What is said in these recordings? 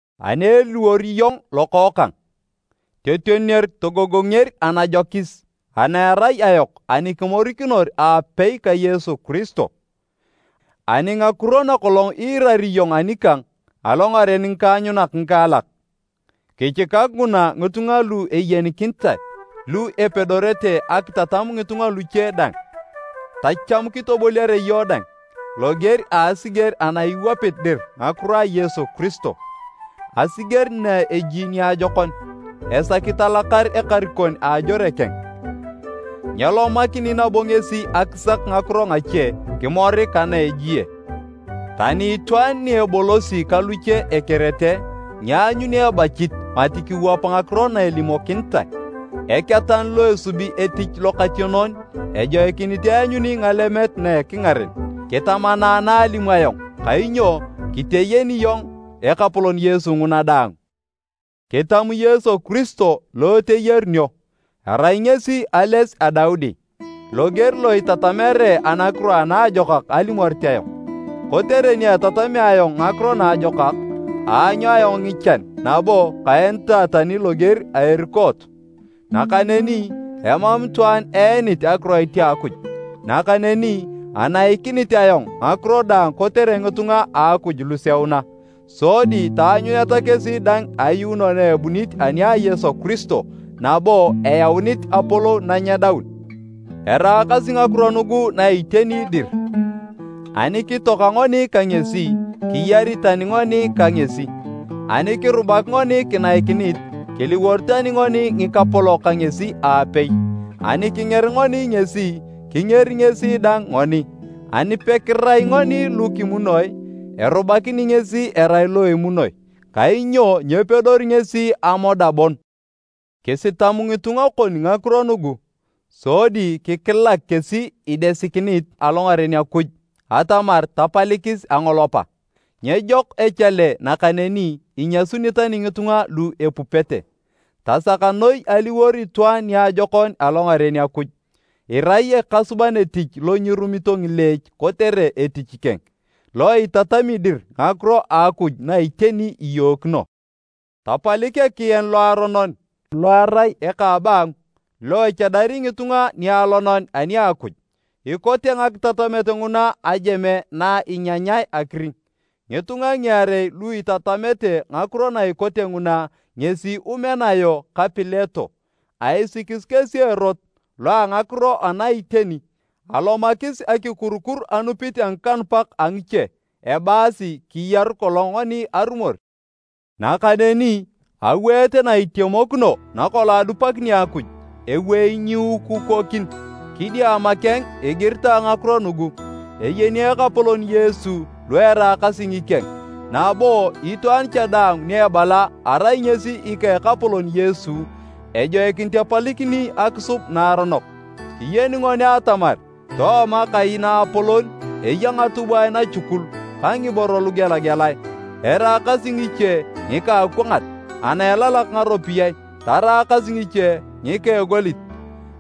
Ani eliwor iyong lokookang, totioner togogonger anajokis ana erai ayok ani kimorikinor aapei ka Yesu Kiristo. Ani ngakiro nakolong iirari iyong anikang alongaren ngikaanyunak ngikaalak, kichikak nguna ngitunga lu eyenikinitae lu epedorete akitatam ngitunga luche dang. Tacham kitoboliare iyong dang loger a asiger ana iwapit dir ngakiro a Yesu Kiristo. Asiger na eji niajokon, esaki talakar ekarikon a ajore keng, nyelomakini nabo ngesi akisak ngakiro ngache kimorik ka na ejie. Tani itwaan ni ebolosi ka luche ekerete, nyeanyuni ebachit mati kiwap ngakiro na elimokinitae. Eketan lo asub etich lokationon, ejoikinit eanyuni ngalemet na ekingaren. Kitamana na alimu ayong kainyo kiteyeni iyong Ekapolon Yesu nguna daang. Kitamu Yesu Kiristo lo eteyarunio. Arai ngesi ales a Daudi, loger lo itatamere Anakiro Anaajokak alimorit ayong. Kotere ni etatamea ayong Ngakiro Naajokak, aanyu ayong ngichan nabo kaenitae tani loger a erukoot. Nakaneni emam itwaan eenit akiroit a Akuj. Nakaneni anaikinit ayong ngakiro daang kotere ngitunga a Akuj luseuna, sodi taanyuneta kesi dang ayuuno na ebunit ani a Yesu Kiristo nabo eyaunit apolou na nyedaun. Eraakasi ngakiro nugu na iteni dir, “Ani kitoaka ngoni ka ngesi, kiyari tani ngoni ka ngesi. Ani kirubak ngoni kinaikinit, kiliwor tani ngoni ngikapolok ka ngesi aapei. Ani kinger ngoni ngesi, kingeri ngesi dang ngoni. Ani pekirai ngoni lu kimunoi, erubakini ngesi erai lo emunoi, kainyo nyepedori ngesi amoda bon.” Kisitam ngitunga kon ngakiro nugu, sodi kikilak kesi idesikinit alongaren Akuj atamar tapalikis angolopa. Nyejok echale nakaneni inyasuni tani ngitunga lu epupete. Tasak noi aliwor itwaan niajokon alongaren Akuj, irai ekasuban etich lo nyirumito ngileech kotere etich keng, lo itatami dir ngakiro a Akuj na iteni iyookino. Tapalik ekian loaronon lo erai eka a abaangu, lo echadari ngitunga nialonan ani a Akuj. Ikote ngakitatamet nguna ajeme na inyanyae akiring. Ngitunga ngiarei lu itatamete ngakiro na ikote nguna ngesi Umenayo ka Pileto. Aisikis kesi erot loa ngakiro ana iteni alomakis akikurukur anupit a ngikanupak a ngiche ebaasi kiyaru kolong ngoni arumor. Nakaneni aweet na itemokino nakolong adupakini Akuj, ewei nyiukukokin, kidiama keng igiritae ngakiro nugu, “Eyeni Ekapolon Yesu lu eraakasi ngikeng” nabo, “Itwaan cha daang ni ebala arai ngesi ika Ekapolon Yesu, ejoikinit epalikini akisub naaronok.” Kiyeni ngoni atamar tooma kai naapolon eya ngatubwae nachukul ka ngiboro lugelagelae, eraakasi ngiche ngika a akwangat ana elalak ngaropiyae taraakas ngiche ngika egolit,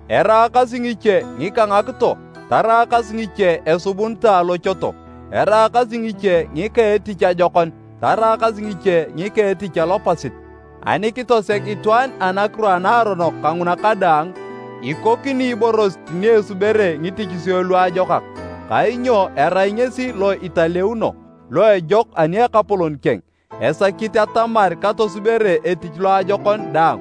eraakasi ngiche ngika ngakito taraakas ngiche esubunitae alochoto, eraakasi ngiche ngika a etich ajokon taraakas ngiche ngika a etich alopasit. Ani kitoseg itwaan anakiro a naaronok kanguna kadaang, ikokini iborosit ni esubere ngitichisio luajokak, kainyo erai ngesi lo italeuno, lo ejok ani Ekapolon keng, esakit atamar katosubere etich loajokon daang.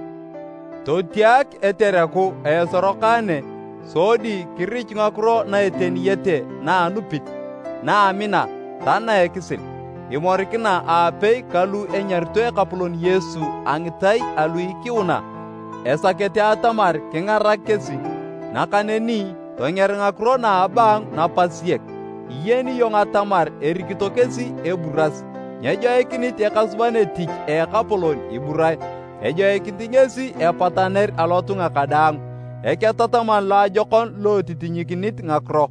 Totiak etereku a esorokane sodi kirichu ngakiro na eteniyete na a anupit, na a amina ta na a ekisil, imorikina aapei ka lu enyarito Ekapolon Yesu a ngitai alu ikiuna esakete atamar kingarak kesi. Nakaneni tonger ngakiro na a abaangu napasiek, iyeni iyong atamar erikito kesi eburas. Nyejoikinit ekasuban etich a Ekapolon iburae. Ejoikinit ngesi epataner alotunga kadaang, eketataman loajokon lo etitinyikinit ngakiro,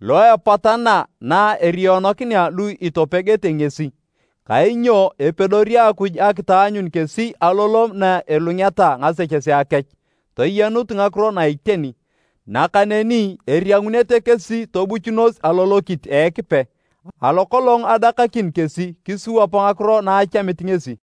lo epatana na eriyonokinea lu itopegete ngesi, kainyo epedori Akuj akitaanyun kesi alolom na elungeta ngasechesea kech toyenut ngakiro na iteni. Nakaneni eriangunete kesi tobuchunos alolokit a Ekipe, alo kolong adakakin kesi kisiwap ngakiro na achamit ngesi.